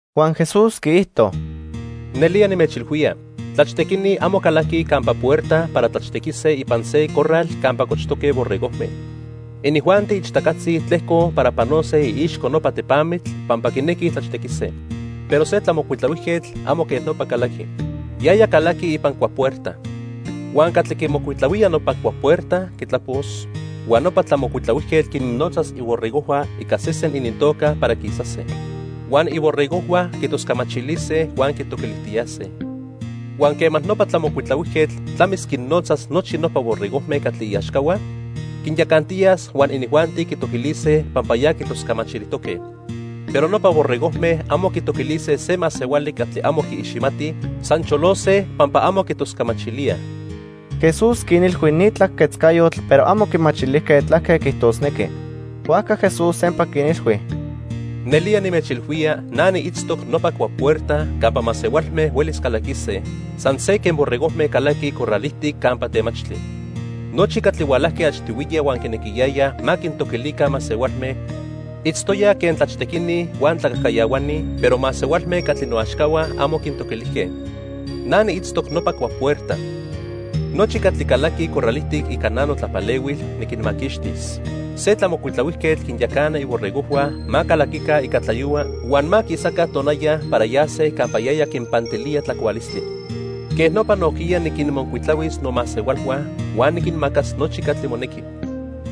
Huan Jesús quiijto: "Nelía nimechilhuía, tlachtequini amo calaquij campa puerta para tlachtequise ipan se corral campa cochtoque borregojme. Inijuanti ichtacatzi tlejcoj para panose iixco nopa tepamitl pampa quinequij tlachtequise. Pero se tlamocuitlahuijquetl amo quej nopa calaqui. Yaya calaqui ipan cuapuerta. Huan catli quimocuitlahuía nopa cuapuerta quitlapos, huan nopa tlamocuitlahuijquetl quinnotzas iborregojhua ica sesen inintoca para quisase. Huan iborregojhua quitoscamachilise huan quitoquilijtiyase. Huan quema nopa tlamocuitlahuijquetl tlamis quinnotzas nochi nopa borregojme catli iaxcahua, quinyacantiyas huan inijuanti quitoquilise pampa ya quitoscamachilijtoque. Pero nopa borregojme amo quitoquilise se masehuali catli amo quiiximatij, san cholose pampa amo quitoscamachilíaj." Jesús quinilhui ni tlaquejquetzcayotl pero amo quimachilijque tlaque quiijtosnequi. Huajca Jesús sempa quinilhui: "Nelía nimechilhuía na niitztoc nopa cuapuerta campa masehualme huelis calaquise san se quen borregojme calaquij corral ijtic campa temachtli. Nochi catli hualajque achtihuiya huan quinequiyayaj ma quintoquilica masehualme, itztoyaj quen tlachtequini huan tlacajcayahuani, pero masehualme catli noaxcahua amo quintoquilijque. Na niitztoc nopa cuapuerta. Nochi catli calaquij corral ijtic ica na notlapalehuil, niquinmaquixtis. Se tlamocuitlahuijquetl quinyacana iborregojhua ma calaquica ica tlayohua huan ma quisaca tonaya para yase campa yaya quinpantilía tlacualistli. Quej nopa nojquiya niquinmocuitlahuis nomasehualhua huan niquinmacas nochi catli monequi.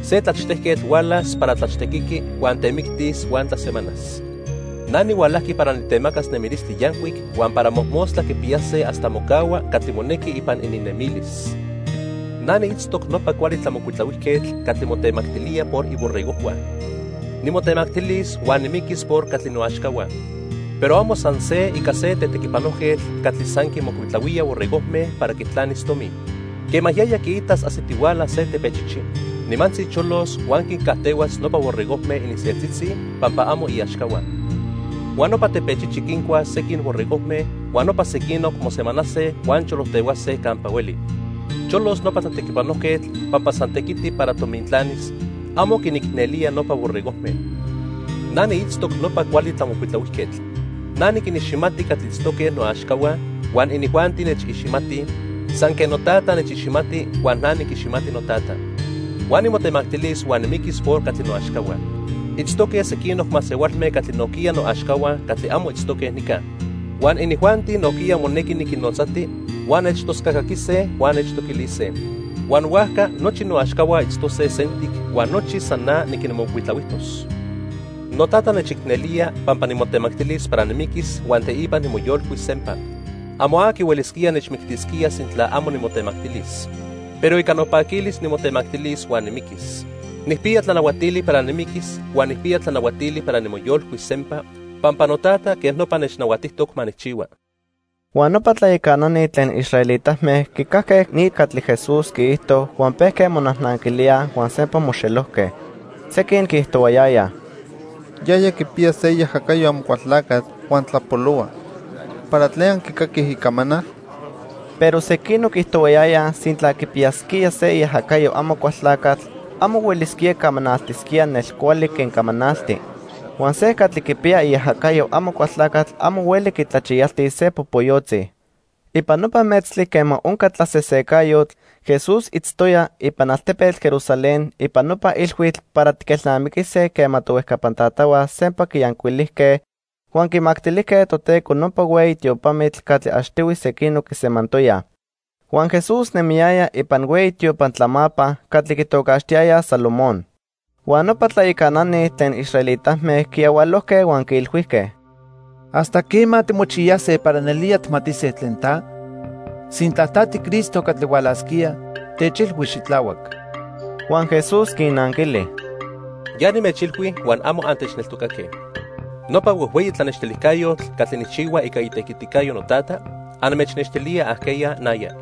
"Se tlachtejquetl hualas para tlachtequiqui huan temictis huan tlasemanas. Na nihualajqui para nitemacas nemilistli yancuic huan para mojmostla quipiyase hasta mocahua catli monequi ipan ininnemilis. Na niitztoc nopa cuali tlamocuitlahuijquetl catli motemactilía por iborregojhua. Nimotemactilis huan nimiquis por catli noaxcahua. Pero amo san se ica se tequipanojquetl catli san quinmocuitlahuía borregojme para quitlanis tomi. Quema yaya quiitas ajsitihuala se tepechichi, nimantzi cholos huan quincajtehuas nopa borregojme ininseltzitzi pampa amo iaxcahua. Huan nopa tepechichi quincuas sequin borregojme huan nopa sequinoc mosejsemanase huan cholojtehuase campa hueli. Cholos nopa tlatequipanojquetl pampa san tequiti para tomintlanis, amo quinicnelía nopa borregojme. "Na niitztoc nopa cuali tlamocuitlahuijquetl. Na niquiniximati catli itztoque noaxcahua huan inijuanti nechiximatij, san quen noTata nechiximati huan na niquiximati noTata. Huan nimotemactilis huan nimiquis por catli noaxcahua. Itztoque sequinoc masehualme catli nojquiya noaxcahua catli amo itztoque nica. Huan inijuanti nojquiya monequi niquinnotzati, huan nechtoscacaquise huan nechtoquilise. Huan huajca nochi noaxcahua itztose sentic huan nochi san na niquinmocuitlahuijtos. "NoTata nechicnelía pampa nimotemactilis para nimiquis huan teipa nimoyolcuis sempa. Amo aqui huelisquía nechmictisquía sintla amo nimotemactilis. Pero ica nopaquilis nimotemactilis huan nimiquis. Nijpiya tlanahuatili para nimiquis huan nijpiya tlanahuatili para nimoyolcuis sempa pampa noTata quej nopa nechnahuatijtoc ma nijchihua." Huan nopa tlayacanani tlen israelitame quicajque ni catli Jesús quiijto huan pejque monajnanquilíaj huan sempa moxelojque. Sequin quiijtohuayayaj: —Yaya quipiya se iajacayo Amocualtlacatl huan tlapolohua. ¿Para tlen anquicaquij icamanal? Pero sequinoc quiijtohuayayaj sintla quipiyasquía se iajacayo Amocualtlacatl, amo huelisquía camanaltisquía nelcuali quen camanalti. Huan se catli quipiya iajacayo Amocualtlacatl amo hueli quitlachiyaltis se popoyotzi. Ipan nopa metztli quema onca tlasesecayotl, Jesús itztoya ipan altepetl Jerusalén ipan nopa ilhuitl para tiquelnamiquise quema tohuejcapan tatahua sempa quiyancuilijque huan quimactilijque Toteco nopa hueyi tiopamitl catli achtihui sequinoc quisemantoyaj. Huan Jesús nemiyaya ipan hueyi tiopan tlamapa catli quitocaxtiyayaj Salomón. Huan nopa tlayacanani tlen israelitame quiyahualojque huan quiilhuijque: —¿Hasta quema timochiyase para nelía tijmatise tlen ta? Sintla ta tiCristo catli hualasquía, techilhui xitlahuac. Huan Jesús quinnanquili: —Ya nimechilhui huan amo antechneltocaque. Nopa huejhueyi tlanextilijcayotl catli nijchihua ica itequiticayo noTata, anmechnextilía ajqueya naya.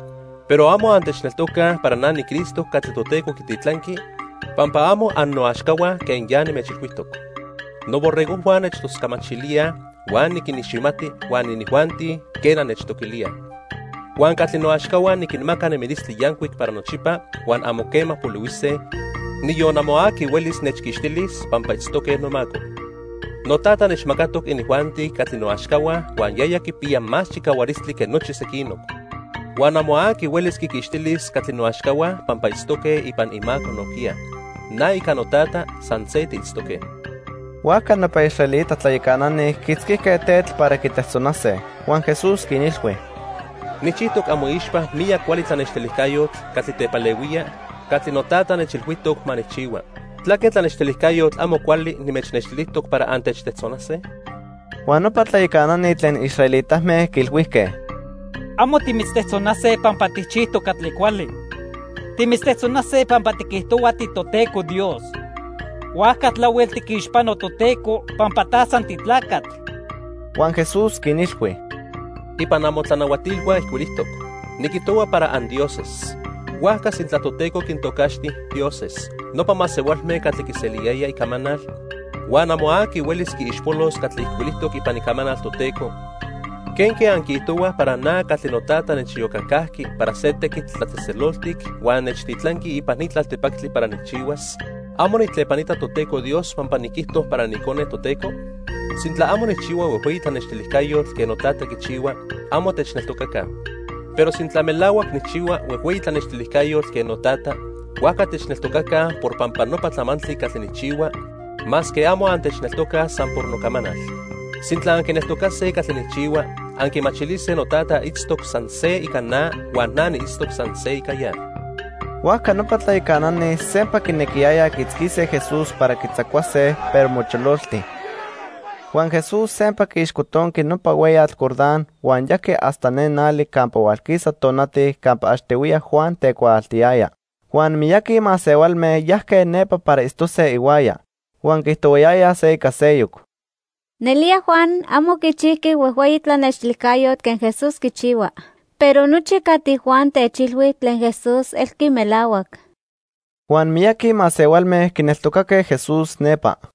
Pero amo antechneltocaj para na niCristo catli Toteco quititlanqui pampa amo annoaxcahua quen ya nimechilhuijtoc. Noborregojhua nechtoscamachilíaj huan niquiniximati huan inijuanti, quena, nechtoquilíaj. Huan catli noaxcahua niquinmaca nemilistli yancuic para nochipa huan amo quema polihuise; niyon amo aqui huelis nechquixtilis pampa itztoque nomaco. NoTata nechmacatoc inijuanti catli noaxcahua huan yaya quipiya más chicahualistli que nochi sequinoc. Huan amo aqui huelis quiquixtilis catli noaxcahua pampa itztoque ipan imaco nojquiya. Na ica noTata san se tiitztoque. Huajca nopa israelita tlayacanani quiitzquijque tetl para quitejtzonase. Huan Jesús quinilhui: —Nijchijtoc amoixpa miyac cuali tlanextilijcayotl catli tepalehuía catli noTata nechilhuijtoc ma nijchihua. ¿Tlaque tlanextilijcayotl amo cuali nimechnextilijtoc para antechtejtzonase? Huan nopa tlayacanani tlen israelitame quiilhuijque: —Amo timitztejtzonase pampa tijchijtoc catli cuali. Timitztejtzonase pampa tiquijtohua tiToteco Dios. Huajca tlahuel tiquixpano Toteco, pampa ta san titlacatl. Huan Jesús quinilhui: —Ipan amotlanahuatilhua ijcuilijtoc: 'Niquijtohua para andioses.' Huajca sintla Toteco quintocaxti 'dioses' nopa masehualme catli quiseliyayaj icamanal, huan amo aqui huelis quiixpolos catli ijcuilijtoc ipan Icamanal Toteco, ¿quenque anquiijtohuaj para na catli noTata nechiyocacajqui para se tequitl tlatzejtzeloltic huan nechtitlanqui ipan ni tlaltipactli para nijchihuas, amo nijtlepanita Toteco Dios pampa niquijto para niIcone Toteco? Sintla amo nijchihua huejhueyi tlanextilijcayotl quen noTata quichihua, amo techneltocaca. Pero sintla melahuac nijchihua huejhueyi tlanextilijcayotl quen noTata, huajca techneltocaca por pampa nopa tlamantli catli nijchihua masque amo antechneltocaj san por nocamanal. Sintla anquineltocase catli nijchihua, anquimachilise noTata itztoc san se ica na huan na niitztoc san se ica ya. Huajca nopa tlayacanani sempa quinequiyayaj quiitzquise Jesús para quitzacuase, pero mochololti. Huan Jesús sempa quiixcotonqui nopa hueyatl Jordán huan yajqui hasta ne nali campa hualquisa tonati campa achtihuiya Juan tecuaaltiyaya. Huan miyaqui masehualme yajque nepa para itztose ihuaya. Huan quiijtohuayayaj se ica seyoc: —Nelía Juan amo quichijqui huejhueyi tlanextilijcayotl quen Jesús quichihua, pero nochi catli Juan techilhui tlen Jesús elqui melahuac. Huan miyaqui masehualme quineltocaque Jesús nepa.